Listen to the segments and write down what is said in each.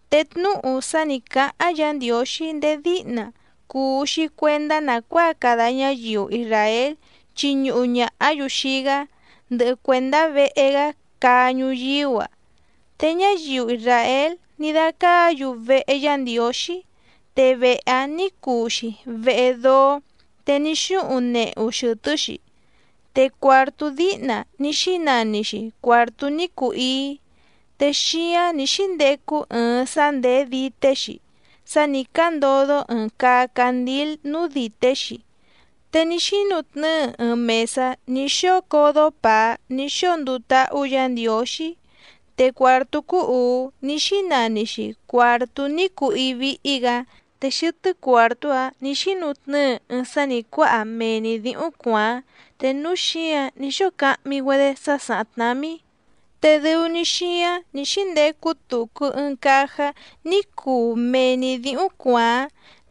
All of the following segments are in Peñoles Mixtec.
Te tnúhu sá nǐ cáháⁿ Yǎ Ndiǒxí ndéé díhna cùu‑xi cuendá nàcuáa cada ñáyiu isràél chiñuhu ñàhá‑yu xii‑gá, ndɨhɨ cuèndá vehe‑gá caa ñuyíú‑a. Te ñáyiu isràél ní dácáǎ‑yu vehe Yá Ndiǒxí, te vehe‑áⁿ nǐ cuu‑xi vehe dóó te ní xúhuⁿ nehu xɨ̀tɨ́‑xi. Te cuàrtú díhna ní xínani‑xi cuàrtú ní cuu íí, te xíáⁿ nǐ xíndecu ɨɨⁿ sá ndèé dité‑xi sá nǐ cándodó ɨ̀ɨⁿ caa candíl núú dìté‑xi, te ní xínutnɨ́ɨ ɨɨⁿ mèsá ní xóo códó pàá ní xóo nduu táhú Yǎ Ndiǒxí. Te cuàrtú cúú ùú ní xínani‑xi cuàrtú ní cuu íí víhí‑gǎ. Te xɨtɨ́ cuàrtú‑áⁿ nǐ xínutnɨ́ɨ ɨɨⁿ sá nǐ cuáha mee‑ni dǐhúⁿ cuàáⁿ te núú xǐǎⁿ ní xóo cahmi‑güedé dúsa sá sàháⁿ tnámí. Te dɨu‑ni xíáⁿ nǐ xíndecu tucu ɨɨⁿ càjá ní cuu mee‑ni dǐhúⁿ cuàáⁿ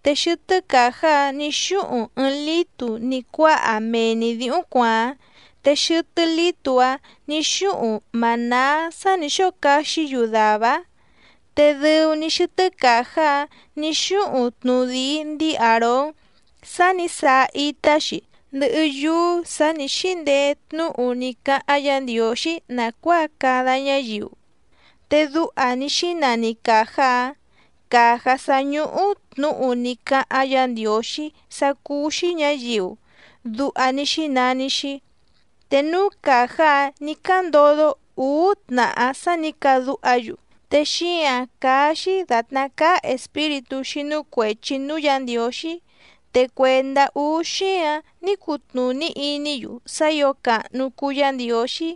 te xɨtɨ́ càjá‑áⁿ nǐ xúhuⁿ ɨɨⁿ lǐtu ní cuáha mee‑ni dǐhúⁿ cuàáⁿ, te xɨtɨ́ lǐtu‑áⁿ nǐ xúhuⁿ mànáá sá nǐ xóo caxí‑yu dàvá‑áⁿ. Te dɨu‑ni xɨtɨ́ càjá‑áⁿ nǐ xúhuⁿ tnudìi ndíi Àrón sá nǐ saa itá‑xi, ndɨhɨ yúú sǎ nǐ xíndeé tnúhu ní cáháⁿ Yǎ Ndiǒxí nàcuáa cada ñáyiu. Te duha ní xínani càjá‑áⁿ: Càjá sá ñúhú tnǔhu ní cáháⁿ Yǎ Ndiǒxí sá cúú‑xí ñǎyiu, duha ní xínani‑xi. Te núú càjá‑áⁿ nǐ cándodó ǔú tnàhá sá nǐ cadúha‑yu, te xíǎⁿ cáá‑xí dàtná cáá espíritú xínú cuèchi núú Yǎ Ndiǒxí. Te cuèndá úú xíǎⁿ ní cutnùní iní‑yu sá ǐo càhnu cuu Yá Ndiǒxí,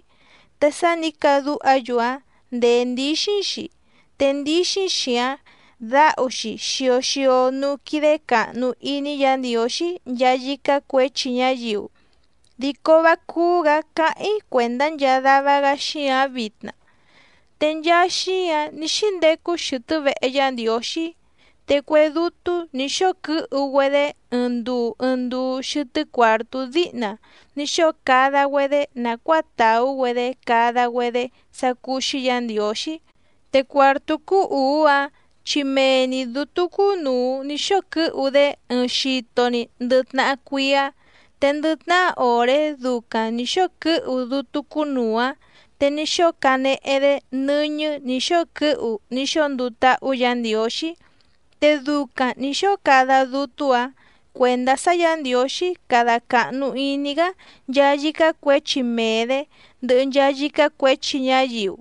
te sá nǐ cadúha‑yu‑áⁿ ndèé ndíxíⁿ‑xi, te ndíxíⁿ‑xi‑áⁿ dǎhu‑xi xio xio núú quídé càhnu iní Yǎ Ndiǒxí nchaa yícá cuěchi ñáyiu, dico vá cúú‑gǎ cáháⁿ‑í cuèndá nchaa dava‑gá xíǎⁿ vitna. Te nchaa xíǎⁿ ní xíndecu xɨtɨ́ vehe Yá Ndiǒxí, te cue dútú nǐ xóo quɨ́hu‑güedé ɨɨⁿ nduu ɨɨⁿ nduu xɨtɨ́ cuàrtú díhna ní xóo cada‑güedé nàcuáa tàú‑güedé cada‑güedé sá cúú‑xí Yǎ Ndiǒxí. Te cuàrtú cúú ùú‑áⁿ chi mee‑ni dǔtú cúnùu ní xóo quɨ́hu‑dé ɨɨⁿ xito‑ni ndɨ tnahá cuíá. Te ndɨ tnahá òré ducaⁿ nǐ xóo quɨ́hu dútú cúnùu‑áⁿ te ní xóo canehe‑dé nɨ́ñɨ́ nǐ xóo quɨ́hu ní xóo nduu táhú Yǎ Ndiǒxí. Te ducaⁿ nǐ xóo cada dútú‑ǎⁿ cuèndá sá Yǎ Ndiǒxí cada càhnu iní‑gá nchaa yícá cuěchi mee‑dě, ndɨhɨ nchaa yícá cuěchi ñáyiu.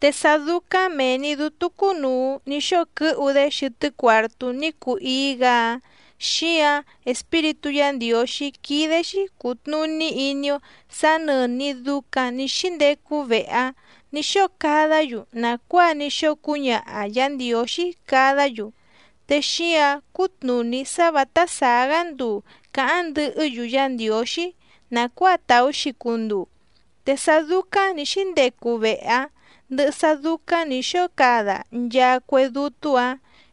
Te sá dúcáⁿ mèe‑ni dútú cúnùu ní xóo quɨ́hu‑dé xɨtɨ́ cuàrtú ní cuu íí‑gǎ‑áⁿ, xíǎⁿ Espíritú Yǎ Ndiǒxí quídé‑xí cùtnuní iní‑ó sǎ nɨ̀ni ducaⁿ ní xíndecu vehe‑áⁿ nǐ xóo cadá‑yu nàcuáa ní xóo cúñaha Yǎ Ndiǒxí cadá‑yu. Te xíǎⁿ cútnùní sá vǎtá sàá‑gá nduu cǎháⁿ ndɨhɨ́‑yu Yá Ndiǒxí nàcuáa tàú‑xi cunduu. Te sá dúcáⁿ nǐ xíndecu vehe‑áⁿ, ndɨhɨ sá dúcáⁿ nǐ xóo cada nchaa cue dútú‑ǎⁿ,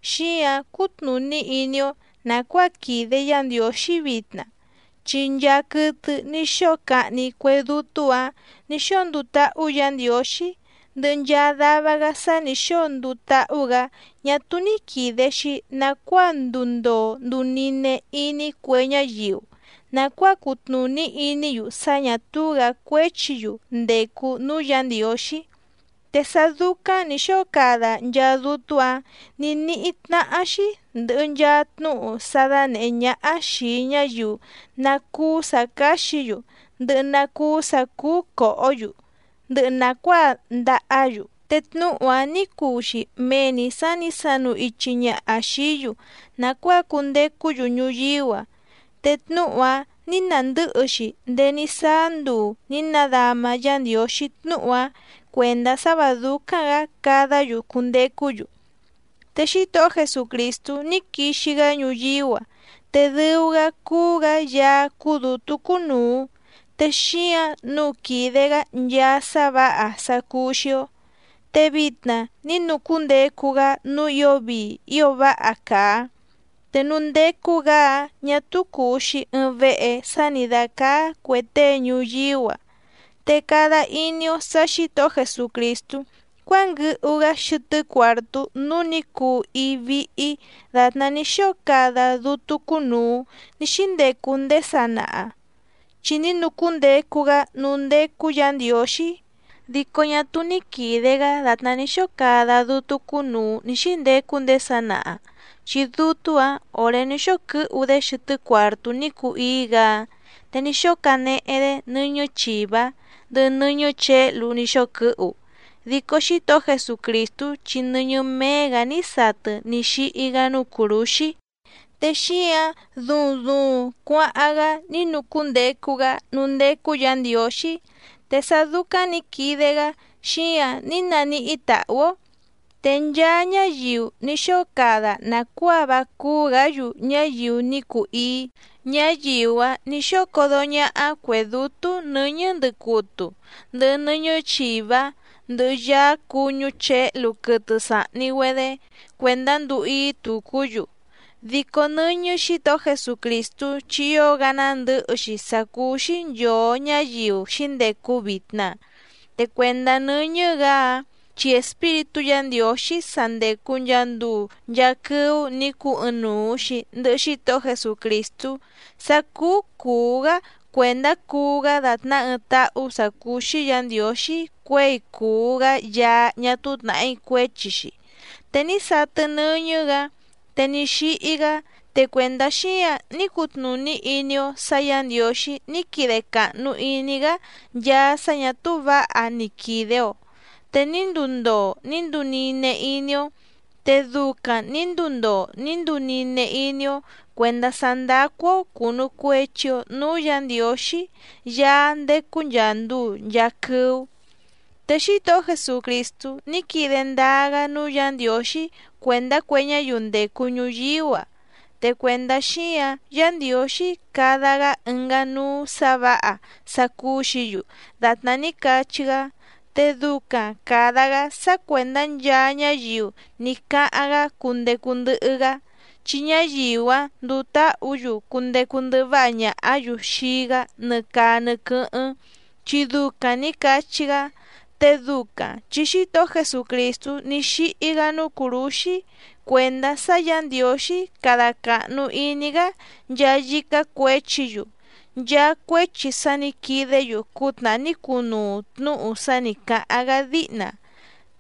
xíǎⁿ cútnùní iní‑ó nàcuáa quìde Yá Ndiǒxí vitna, chi nchaa quɨtɨ ní xóo cahni cue dútú‑ǎⁿ nǐ xóo nduu táhú Yǎ Ndiǒxí, ndɨhɨ nchaa dava‑gá sá nǐ xóo nduu táhú‑gǎ ñá túú ní quìde‑xi nacuáa nduu ndoo nduu nine iní cue ñáyiu nàcuáa cutnùní iní‑yu sá ñà túú‑gǎ cuéchi‑yu ndècu núú Yǎ Ndiǒxí. Te sá dúcáⁿ nǐ xóo cada nchaa dútú‑ǎⁿ nǐ níhí tnáhá‑xí ndɨ̀hɨ nchaa tnúhu sá dánèhé ñáhá xìi ñáyiu ná cúú sǎ cáxǐ‑yu ndɨhɨ ná cúú sǎ cúú còhó‑yu ndɨhɨ nàcuáa ndàhá‑yu. Te tnúhu‑áⁿ nǐ cuu‑xi mee‑ni sǎ nǐ sanu ichi ñaha xìí‑yu nàcuáa cundecú‑yu ñuyíú‑a. Te tnúhu‑áⁿ nǐ nàndɨ́hɨ‑xi ndéé ní sáá nduu nǐ nadama Yá Ndiǒxí tnúhu‑áⁿ cuèndá sá vǎ dúcáⁿ‑gǎ cadá‑yu cundecú‑yu. Te Xítohó Jesucrìstú ní quixi‑gá ñuyíú‑a, te dɨu‑gá cúú‑gǎ Yaá cúú dǔtú cúnùu, te xíǎⁿ nǔu quìde‑gá nchaa sá vǎha sá cúú‑xí‑ó. Te vitna ní nucúndecu‑gá núú ǐo vii ío váha càa, te núú ndécú‑gǎ‑áⁿ ñà túú cùu‑xi ɨɨⁿ vehe sá nǐ dácáá cuè tée ñuyíú‑a. Te cada iní‑ó sǎ Xǐtohó Jesucrìstú cuánguɨhu‑gá xɨtɨ́ cuàrtú núú nǐ cuu íí víhí dàtná ní xóo cada dútú cúnùu ní xíndecu ndéé sanaha, chi ní nucúndecu‑gá núú ndécú Yǎ Ndiǒxí. Dico ñá túú ni quìde‑gá dàtná ní xóo cada dútú cúnùu ní xíndecu ndéé sanaha, chi dútú‑ǎⁿ òré ní xóo quɨ́hu‑dé xɨtɨ́ cuàrtú ní cuu íí‑gǎ‑áⁿ, te ní xóo canehe‑dé nɨ́ñɨ́ chìvá ndɨhɨ nɨ́ñɨ́ chěhlu ní xóo quɨ́hu. Dico Xítohó Jesucrìstú chi nɨ́ñɨ́ méé‑gǎ ní satɨ ní xíhí‑gá núú cùrúxí, te xíǎⁿ duuⁿ duuⁿ cuáháⁿ‑gá ní nucúndecu‑gá núú ndécú Yǎ Ndiǒxí. Te sá dúcáⁿ nǐ quide‑gá xíǎⁿ ní naníhí tàhú‑ó. Te nchaa ñáyiu ní xóo cada nàcuáa vá cúú‑gǎ‑yu ñáyiu ní cuu íí, ñáyiu‑áⁿ nǐ xóo códó ñáhá cuè dútú nɨ̌ñɨ́ ndɨcutu, ndɨhɨ nɨ́ñɨ́ chìvá, ndɨhɨ yáá cùñú chěhlu quɨtɨ sàhni‑güedé cuèndá nduu íí tucú‑yu. ¡Dico nɨ́ñɨ́ Xǐtohó Jesucrìstú chi ío‑gá nándɨ̌hɨ‑xi sá cúú‑xí nchòo ñáyiu xǐndecu vitna! Te cuèndá nɨ́ñɨ́‑gǎ‑áⁿ, chi Espíritú Yǎ Ndiǒxí sá ndécú nchàa nduu nchaa quɨ́ú nǐ cuu ɨɨⁿnuu‑xi ndɨ̀hɨ Xítohó Jesucrìstú sá cúú cùú‑gá cuèndá cuu‑gá dàtná ɨɨⁿ táhú sǎ cúú‑xí Yǎ Ndiǒxí cuěi cùu‑gá Yaá ñá túú tnàhí cuéchi‑xi, te ní satɨ nɨ́ñɨ́‑gǎ te ní xíhí‑gá. Te cuèndá xíǎⁿ ní cutnùní iní‑ó sǎ Yǎ Ndiǒxí ní quide càhnu iní‑gá nchaa sá ñà túú vǎha ní quide‑o, te ní nduu ndoo ní nduu nine iní‑ó. Te ducaⁿ nǐ nduu ndoo ní nduu nine iní‑ó cuèndá sá ndácú‑ó cùnu cuechi‑o núú Yǎ Ndiǒxí Yaá ndécú nchàa nduu nchaa quɨ́ú. Te Xítohó Jesucrìstú ní quide ndáá‑gá núú Yǎ Ndiǒxí cuèndá cue ñáyiu ndècu ñuyíú‑a. Te cuèndá xíǎⁿ Yǎ Ndiǒxí cada‑gá ɨngá núú sǎ vǎha sá cúú‑xǐ‑yu dàtná ní cachí‑gá, te ducaⁿ càda‑gá sá cuèndá nchaa ñáyiu ní cáháⁿ‑gá cundecu ndɨhɨ‑gá, chi ñáyiu‑áⁿ nduu táhǔ‑yu cundecu ndɨhɨ váha ñàhá‑yu xii‑gá nɨ caa nɨ quɨ́hɨ́ⁿ chi ducaⁿ nǐ cachí‑gá, te ducaⁿ chi Xítohó Jesucrìstú ní xíhí‑gá núú cùrúxí cuèndá sá Yǎ Ndiǒxí cada càhnu iní‑gá nchaa yícá cuěchi‑yu, nchaa cuéchi sá nǐ quidé‑yu cútnàhá ní cunuu tnúhu sá nǐ cáháⁿ‑gá díhna.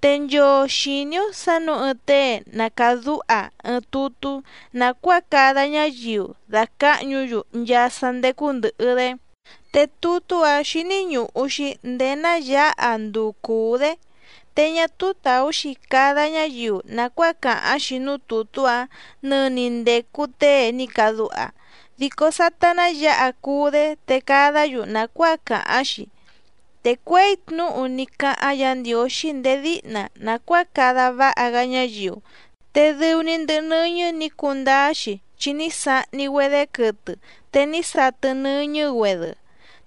Te nchoo xìní‑ó sǎ nǔu ɨɨⁿ tée na càdúha ɨɨⁿ tutú nàcuáa cada ñáyiu dàcáhñu‑yu nchaa sá ndécú ndɨ̀hɨ‑dé, te tutú‑áⁿ xíní ñùhu‑xi ndéé ná yǎha nduu cùú‑dé. Te ñá túú tàú‑xi cada ñáyiu nàcuáa càháⁿ‑xi núú tùtú‑áⁿ nɨni ndècu tée ní cadúha, dico sátá ná yǎha cuú‑dé te cadá‑yu nàcuáa càháⁿ‑xi. Te cuěi tnúhu ní cáháⁿ Yǎ Ndiǒxí ndéé díhna nàcuáa cada váha‑gá ñáyiu, te dɨu‑ni ndɨhɨ nɨ́ñɨ́ nǐ cundáá‑xi chi ní sahni‑güedé quɨtɨ te ní satɨ nɨ́ñɨ́‑güedɨ.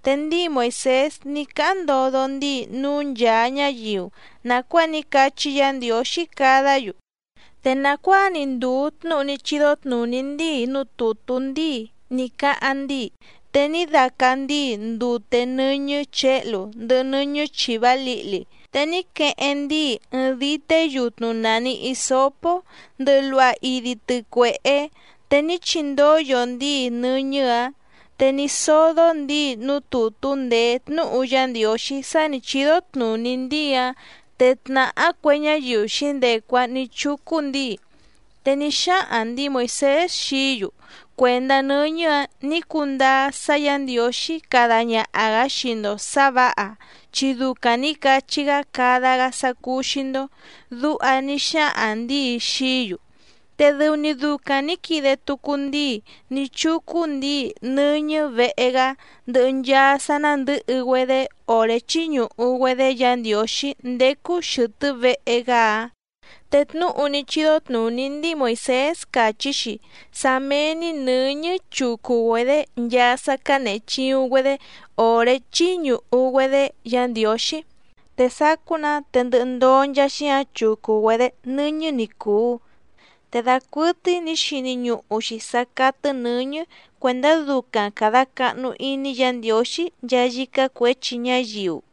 Te ndíi Moìsés ní cáháⁿ ndodo ndíi núú nchàa ñáyiu nàcuáa ní cachí Yǎ Ndiǒxí cadá‑yu, te nàcuáa‑ni ndùu tnúhu ní chídó tnùní ndíi núú tùtú ndíi ní cáháⁿ ndíi, te ní dácá ndǐi ndute nɨ́ñɨ́ chěhlu ndɨhɨ nɨ́ñɨ́ chìvá lǐhli, te ní queheⁿ ndíi ɨɨⁿ dité yutnu nàni hisópó ndɨhɨ luha idi tɨcuèhé, te ní chindóyo ndíi nɨ́ñɨ́‑ǎⁿ. Te ní sódó ndíi núú tùtú ndèé tnúhu Yá Ndiǒxí sá nǐ chídó tnùní ndíi‑áⁿ, te tnàhá cue ñáyiu xǐndecu‑áⁿ nǐ chúcú ndǐi. Te ní xáhaⁿ ndǐi Moìsés xií‑yu: “Cuèndá nɨ́ñɨ́‑a ní cundáá sá Yǎ Ndiǒxí cada ñaha‑gǎ xii‑ndo sǎ vǎha chi ducaⁿ nǐ cachí‑gá cada‑gá sá cúú‑xí‑ndó”, duha ní xáhaⁿ ndǐi xií‑yu. Te dɨu‑ni ducaⁿ nǐ quide tucu ndíi ní chúcú ndǐi nɨ́ñɨ́ vehe‑gá ndɨhɨ nchaa sá nándɨ̌hɨ‑güedé òré chíñùhu‑güedé Yǎ Ndiǒxí ndécú xɨ̀tɨ́ vehe‑gá‑áⁿ. Te tnúhu ní chídó tnùní ndíi Moìsés càchí‑xi sá méé‑ní nɨ̌ñɨ́ chucu‑güedě nchaa sá cǎnehe chìuⁿ‑güedé òré chíñùhu‑güedé Yǎ Ndiǒxí, te sacú‑nǎ te ndɨhɨ ndoo nchaa xíǎⁿ chucu‑güedě nɨ́ñɨ́ ni cùu. Te dacuɨtɨ́í nǐ xini ñuhu‑xi sǎ cátɨ́ nɨ̌ñɨ́ cuèndá ducaⁿ càda cahnu iní Yǎ Ndiǒxí nchaa yícá cuěchi ñáyiu.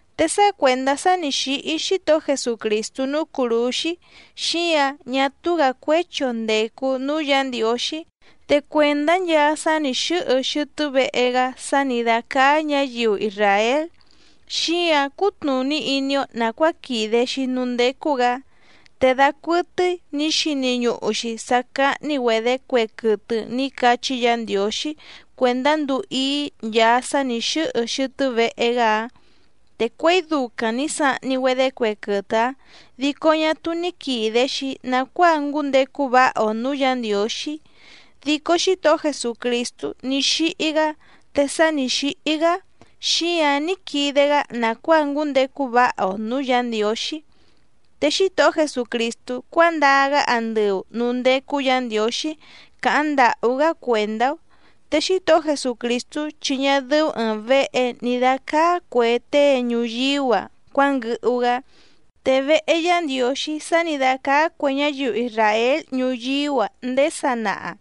Te sá cuèndá sá nǐ xíhí Xítohó Jesucrìstú núú cùrúxí, xíǎⁿ ñá túú‑gǎ cuéchi‑o ndècu núú Yǎ Ndiǒxí. Te cuèndá nchaa sá nǐ xɨ́hɨ xɨtɨ́ vehe‑gá sá nǐ dácáá ñǎyiu isràél xíǎⁿ cútnùní iní‑ó nàcuáa quìde‑xi núú ndécú‑gǎ. Te dacuɨtɨ́í nǐ xini ñuhu‑xi sǎ cáhní‑güedě cue quɨtɨ ní cachí Yǎ Ndiǒxí cuèndá nduu íí nchaa sá nǐ xɨ́hɨ xɨtɨ́ vehe‑gá‑áⁿ. Te cuěi ducaⁿ nǐ sahni‑güedé cue quɨtɨ‑áⁿ dico ñá túú ní quìde‑xi nacuáa ngúndecu váha‑o nǔú Yǎ Ndiǒxí. Dico Xítohó Jesucrìstú ní xíhí‑gá, te sá nǐ xíhí‑gá xíǎⁿ ní quide‑gá nàcuáa ngúndecu váha‑o nǔú Yǎ Ndiǒxí. Te Xítohó Jesucrìstú cuándaa‑gá andɨu nǔú ndécú Yǎ Ndiǒxí càháⁿ ndàhú‑gá cuèndá‑ó, te Xítohó Jesucrìstú chi ñá dɨ́ú ɨ̀ɨⁿ vehe ní dácáá cuè tée ñuyíú‑a cuánguɨhu‑gá. Te vehe Yá Ndiǒxí sá nǐ dácáá cuè ñáyiu isràél ñuyíú‑a ndéé sanaha,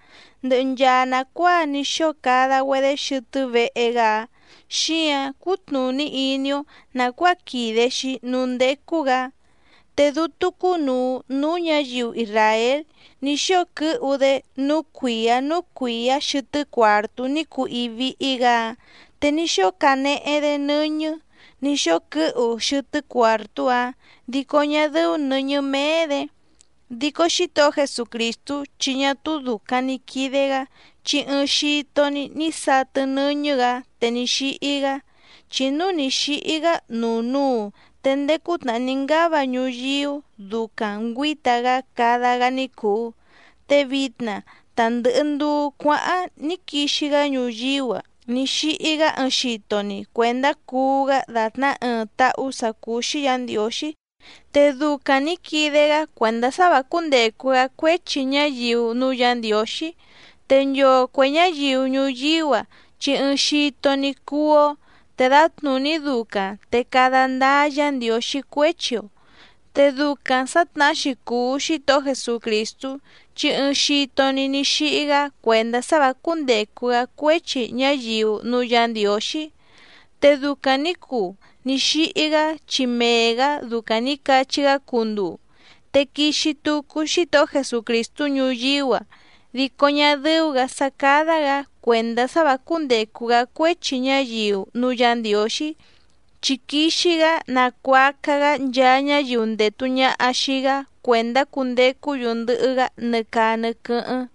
ndɨhɨ nchaa nàcuáa ní xóo cada‑güedé xɨtɨ́ vehe‑gá‑áⁿ xíǎⁿ cútnùní iní‑ó nàcuáa quìde‑xi núú ndécú‑gǎ. Te dútú cúnùu núú ñǎyiu isràél ní xóo quɨ́hu‑dé núú cuìá núú cuìá xɨtɨ́ cuàrtú ní cuu íí víhí‑gǎ‑áⁿ, te ní xóo canehe‑dé nɨ́ñɨ́ nǐ xóo quɨ́hu xɨtɨ́ cuàrtú‑áⁿ dico ñá dɨ́ú nɨ̌ñɨ́ méé‑dě. Dico Xítohó Jesucrìstú chi ñá túú dùcaⁿ ni quide‑gá chi ɨɨⁿ xito‑ni ní satɨ nɨ́ñɨ́‑gǎ te ní xíhí‑gá. Chi núu ni xǐhí‑gá nuu núu te ndéé cútnàhá ní ngáva ñuyíú ducaⁿ ngüǐta‑gá cada‑gá ní cùu, te vitna ta ndɨ̀hɨ nduu cuáháⁿ ní quixi‑gá ñuyíú‑a ní xíhí‑gá ɨɨⁿ xito‑ni cuèndá cuu‑gá dàtná ɨɨⁿ táhú sǎ cúú‑xí Yǎ Ndiǒxí, te ducaⁿ nǐ quide‑gá cuèndá sá vǎ cúndècu‑gá cuéchi ñáyiu núú Yǎ Ndiǒxí. Te nchoo cuè ñáyiu ñuyíú‑a chi ɨɨⁿ xito‑ni cuú‑ó te dǎtnùní ducaⁿ te cada ndáá Yǎ Ndiǒxí cuéchi‑o. Te ducaⁿ sǎtnahá‑xi cùu Xítohó Jesucrìstú chi ɨɨⁿ xito‑ni ní xíhí‑gá cuèndá sá vǎ cúndècu‑gá cuéchi ñáyiu núú Yǎ Ndiǒxí, te ducaⁿ nǐ cuu ní xíhí‑gá chi mee‑gǎ ducaⁿ nǐ cachí‑gá cunduu. Te quixi tucu Xítohó Jesucrìstú ñuyíú‑a dico ñá dɨ́ú‑gǎ sá cádá‑gǎ cuèndá sá vǎ cúndècu‑gá cuéchi ñáyiu núú Yǎ Ndiǒxí, chi quixi‑gá nacuaca‑gá nchaa ñáyiu ndètu ñaha xii‑gá cuèndá cundecú‑yu ndɨhɨ‑gá nɨ caa nɨ quɨ́hɨ́ⁿ.